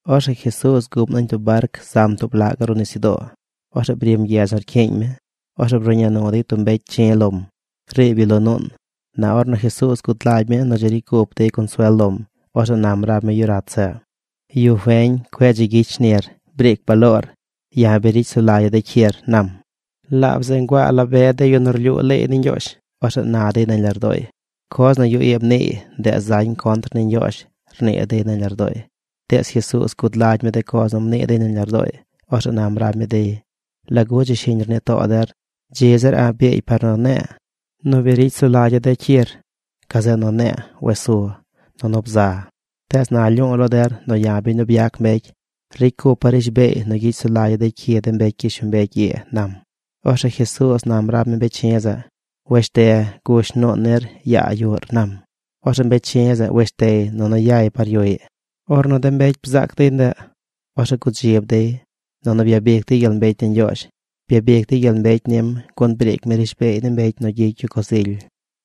Orzeꞌ Jesuuz guꞌm nañ tub barc zam tub laꞌ gaꞌ ruꞌ nisyudoo. Orzeꞌ brim gyedz nu rcyiiñ mi. Orzeꞌ bruꞌña nu dey tub mbecy chi̱ lom. Riib yu lo nuun. Na ornu Jesuuz gud lagy mi nu dzi ricy cup dey consuel lom, orzeꞌ nam rab mi yu rat zeꞌ: ―Yu feñ, cueꞌ dzi gyicy shnir. Briic baloor. Ya̱ bi ricy sulagya̱ de cyir ―nam. Laab zeꞌ nguaa la be de yu nu rlyuu leey ni Ñgyoozh. Orzeꞌ na dey nañ lardooy: “Coz nu yu ii mniiy, ndeꞌ zañ contr ni Ñgyoozh”, rnii dey nañ lardooy. Tees Jesuuz gud lagy mi de coz nu mnii dey nañ lardooy. Orzeꞌ nam rab mi dey. ―¿Lagu dzi shiñ rnii too der? Dzi zir a̱ꞌ biigy par nu ne̱e̱ nu bi ricy sulagya̱ de cyir gazeꞌ nu ne̱e̱ nu wes su nunu bza. Tees na lyu̱u̱ lo der nu ya̱, biñ nu byac mbecy, ricy cupa̱ rishbeey nu gyicy sulagya̱ de cyi de mbecy gyishlombecy ii ―nam. Orzeꞌ Jesuuz nam rab mi mbecy chi̱ zeꞌ: ―Weshte. Gush nuun nir yaa yuꞌr ―nam. Orzeꞌ mbecy chi̱ zeꞌ weshtey nunu yay par yuꞌy. Ornu de mbecy bzaac dey ndeꞌ, orzeꞌ gudzib dey, nunu byabic dey gyel mbecy ni Ñgyoozh. Byabic dey gyel mbecy nim gun briic mi rishbeey ni mbecy nu gyicy yu coz ily.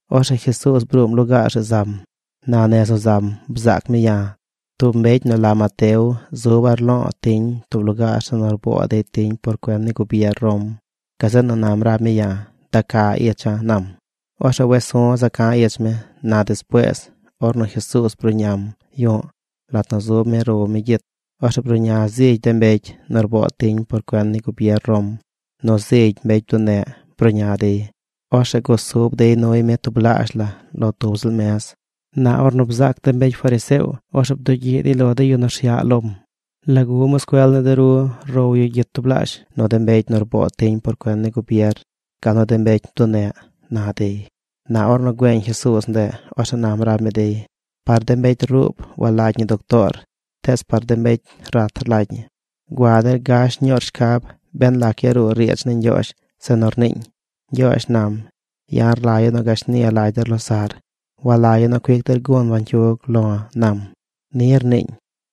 Orzeꞌ Jesuuz bruum lugaar zeꞌ zam. Na nez nu zam bzaac mi ya̱, tub mbecy nu la Mateo zuba̱ rlo̱o̱ tiñ tub lugaar zeꞌ nu rboo dey tiñ por cuen ni gubier Rom. Gazeꞌ nu nam rab mi ya̱: ―Da ca icha̱ ―nam. Orzeꞌ wes su̱ za ca̱ ich mi. Na despuees, ornu Jesuuz bruꞌñam yu̱ꞌ, lat nu zub mi row mi gyit, orzeꞌ bruꞌña zigy de mbecy nu rboo tiñ por cuen ni gubier Rom, nu zigy de mbecy bduneꞌ bruꞌña dey. Orzeꞌ gusub dey nuy mi tublaazh la lo tub ziꞌl mez. Na ornu bzaac de mbecy fariseo, orzeꞌ bdugyiꞌ dey lo de yu nu rsyaꞌ lom: ―¿Lagu moscuel ni de ru row yu gyit tublaazh nu de mbecy nu rboo tiñ por cuen ni gubier gal nu de mbecy bduneꞌ? ―na dey. Na ornu güeñ Jesuuz ndeꞌ, orzeꞌ nam rab mi dey: ―Par de mbecy ruub walagy ñi doctoor tees par de mbecy rat rlagy ñi. Gua der. Gash ñuur shcab ben lac yaruu riidz ni Ñgyoozh zeꞌ nu rniiñ: “Ñgyoozh nam: Ya̱ rlagya̱ nu gashni lagy der losaꞌr. Walagya̱ nu cuic der gun bañcyug lo̱, nam.” Ni rniiñ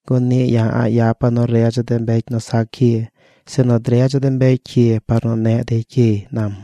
gun niꞌ ya̱ a̱ꞌ yapa̱ nu redza̱ de mbecy nu sac cyi, sinu dredza̱ de mbecy cyi par nu neꞌ dey cyiy ―nam.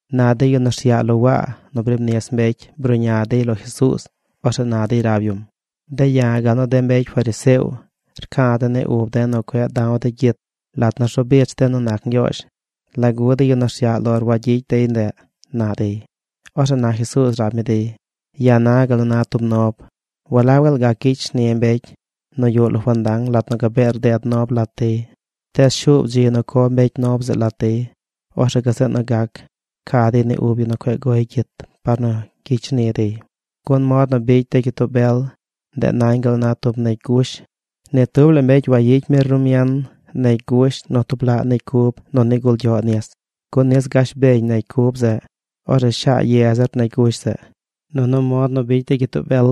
Na de yu nu rsyaꞌ lo Waa nu briib nis mbecy bruꞌña dey lo Jesuuz. Orzeꞌ na dey rab yum: ―De̱ ya̱ gal nu de mbecy fariseo rca̱ de̱ ni uba̱ nu cueꞌ da̱w de̱ gyit lat nu rzu bich de̱ nu nac Ñgyoozh. ¿Lagu de yu nu rsyaꞌ lor wagyicy dey ndeꞌ? ―na dey. Orzeꞌ na Jesuuz nam rab mi dey: ―Ya̱ na gal nu na tub nob. ¿Walab gaal gac gyicy shni de mbecy nu yuꞌ lo fandang lat nu gabee rded nob lat dey? Tees shuub dzi nu co mbecy nob zeꞌ lat dey. Orzeꞌ gazeꞌ nu gac ca dey ni ub yu nu cueꞌ goy gyit par nu gyicy shni dey. ’Gun mod nu bicy de gyitoo bel, ndeꞌ nañ gal nu na tub negy gush. Ni tub la mbecy wayicy mi rumien negy gush nu tub laꞌ negy cub nu nigul gyoꞌ nis, gun nis gash beñ negy cub zeꞌ. Orzeꞌ shaa ye zir negy gush zeꞌ. Nunu mod nu bicy de gyitoo bel,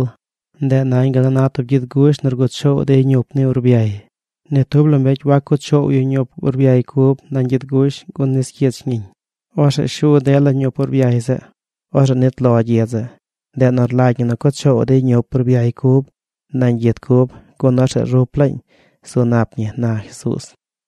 ndeꞌ nañ gal nu na tub gyid gush nu rguꞌ choow dey ñup ni urbyay. Ni tub la mbecy wac cuꞌ choow yu ñup urbyay cub nañ gyid gush gun nis cyich ñiñ. Orzeꞌ shu dela ñup urbyay zeꞌ. Orzeꞌ nit lo gyid zeꞌ. Ndeꞌ nu rlagy ñi cuꞌ choow dey ñup urbyay cub nañ gyid cub, gun orzeꞌ rup laañ zu nap ñi ―na Jesuuz.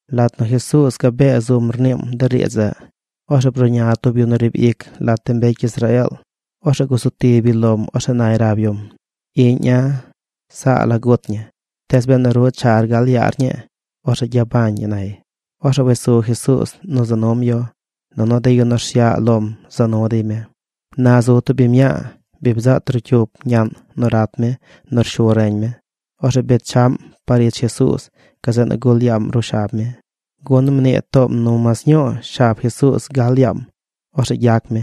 Lat nu Jesuuz gabee zum rniim de riidz zeꞌ, orzeꞌ bruꞌña tub yu nu riib ic lat de mbecy Israeel. Orzeꞌ gusu tib yu lom. Orzeꞌ nay rab yum: ―Iꞌña̱ saa la gut ñi. Tees benu ru char gal yaar ñii, orzeꞌ gyabañ ñi ―nay. Orzeꞌ wes su Jesuuz nu za num yu. Nunu de yu nu rsyaꞌ lom za nu dey mi. Na zu tub biñ mñaa. Bi bzaꞌ trocyup ñaꞌn nu rat mi nu rshu reñ mi. Orzeꞌ bechaꞌm par ich Jesuuz. Gazeꞌ nu gul yaam ruꞌ shab mi, gun mnii toom nu mas ñuu shab Jesuuz gal yaam, orzeꞌ gyac mi.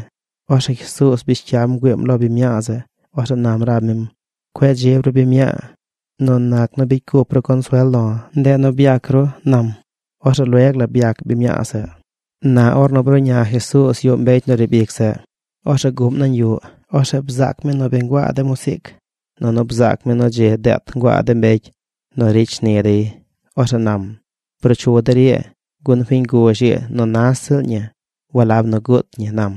Orzeꞌ Jesuuz bish cyam bgüiim lo biñ mñaa zeꞌ. Orzeꞌ nam rab mim: ―Cueꞌ dzib ru biñ mñaa. Nu nac nu bicy cup ru consuel lo̱, ndeꞌ nu byac ru ―nam. Orzeꞌ lueg la byac biñ mñaa zeꞌ. Na ornu bruꞌña Jesuuz yuꞌ mbecy nu riib ic zeꞌ, orzeꞌ guꞌm nañ yuꞌ. Orzeꞌ bzaac mi nu bi nguaa de musiic, nunu bzaac mi nu dzi deet nguaa de mbecy nu ricy shni dey. Orzeꞌ nam: ―Bruu chu der ii, gun fiñ guzh ii nu nas ziꞌl ñi walab nu guut ñi ―nam.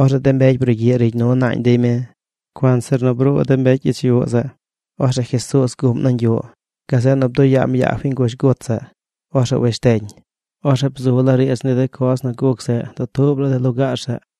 Orzeꞌ de mbecy brugyiꞌ rigy nu naañ dey mi. Cuanzir nu bruu de mbecy ich yuꞌ zeꞌ, orzeꞌ Jesuuz guꞌm nañ yuꞌ. Gazeꞌ nu bduꞌ yaam yaa fiñ guzh gut zeꞌ. Orzeꞌ wesh teñ. Orzeꞌ bzu laa riidz ni de coz nu guc zeꞌ dutuub la de lugaar zeꞌ.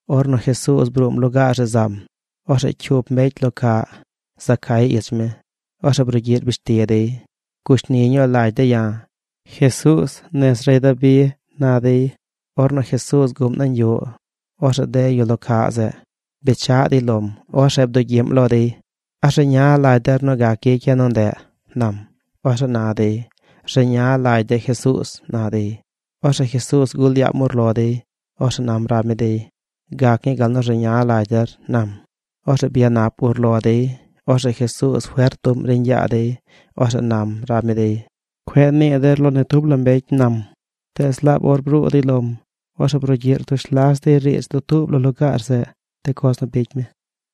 Ornu Jesuuz bruum lugaar zeꞌ zam, orzeꞌ cyup mbecy lo caꞌ za cay ich mi. Orzeꞌ brugyiꞌ rbish ti dey: ―Gushni ñuu lagy de̱ ya̱, Jesuuz, nez rey Dabi ―na dey. Ornu Jesuuz guꞌm nañ yuꞌ, orzeꞌ de yu lo caꞌ zeꞌ bechaꞌ dey lom. Orzeꞌ bdugyiꞌm lo dey: ―¿A rzeña lagy der nu gac gyicya̱ nu ndeꞌ? ―nam. Orzeꞌ na dey: ―Rzeña lagy de̱ Jesuuz ―na dey. Orzeꞌ Jesuuz gul yaam urlo dey. Orzeꞌ nam rab mi dey: ―Gac ñii gal nu rzeña lagy der ―nam. Orzeꞌ byanap urlo dey. Orzeꞌ Jesuuz fert bduꞌm riiñ yaa dey. Orzeꞌ nam rab mi dey: ―Cueꞌ nii der lo ni tub la mbecy ―nam. Tees, laab or bruu dey lom, orzeꞌ brugyiꞌ rtush las dey riidz dutuub la lugaar zeꞌ, de coz nu bicy mi.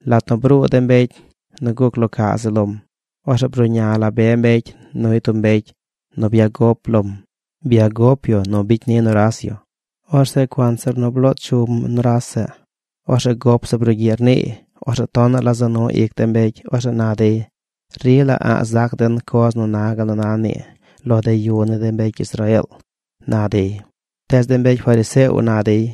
Lat nu bruu de mbecy nu guc lo caꞌ zeꞌ lom, orzeꞌ bruꞌña la be mbecy nuy tub mbecy nu byagop lom. Byagop yu nu bicy ni nuras yu. Orzeꞌ cuanzir nu bloo chum nuras zeꞌ, orzeꞌ gop zeꞌ brugyiꞌ rniiy. Orzeꞌ tonaꞌ la za nu ic de mbecy. Orzeꞌ na dey: ―Rila a̱ꞌ zac den coz nu na gal nu na nii lo de yu ni de mbecy Israeel ―na dey. Tees de mbecy fariseo na dey: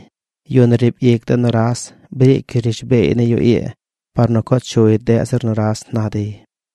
―Yu nu riib ic de nuras briic yu rishbeey ni yu ii par nu co chuy deꞌ zir nuras ―na dey.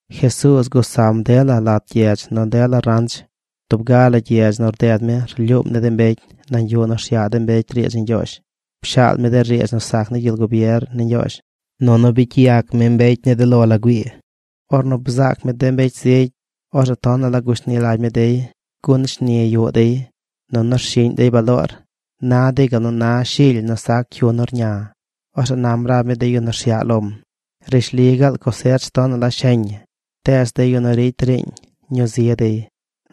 Jesuuz gusam dela lat gyedz nu dela ranch. Tub ga la gyedz nu rded mi rlyuum ni de mbecy nañ yuꞌ nu rsyaꞌ mbecy riidz ni Ñgyoozh. Pshaal mi de riidz nu sac ni gyel gubier ni Ñgyoozh, nunu bicy yac mi mbecy ni de lo la güii. Ornu bzaac mi de mbecy zigy, orzeꞌ tonaꞌ la gushni lagy mi dey, gun shni yuꞌ dey, nunu rshiꞌñ dey baloor. Na dey gal nu na shily nu sac cyu nu rña. Orzeꞌ nam rab mi de yu nu rsyaꞌ lom: ―Rishli gaal cosech tonaꞌ la sheñ ñi, tees de yu nu ricy riiñ, ñuu zi dey.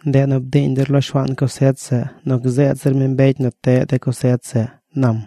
Ndeꞌ nu, bdiiñ der lo Shuaan cosech zeꞌ nu gzeed zir mi mbecy nu teꞌ de cosech zeꞌ ―nam.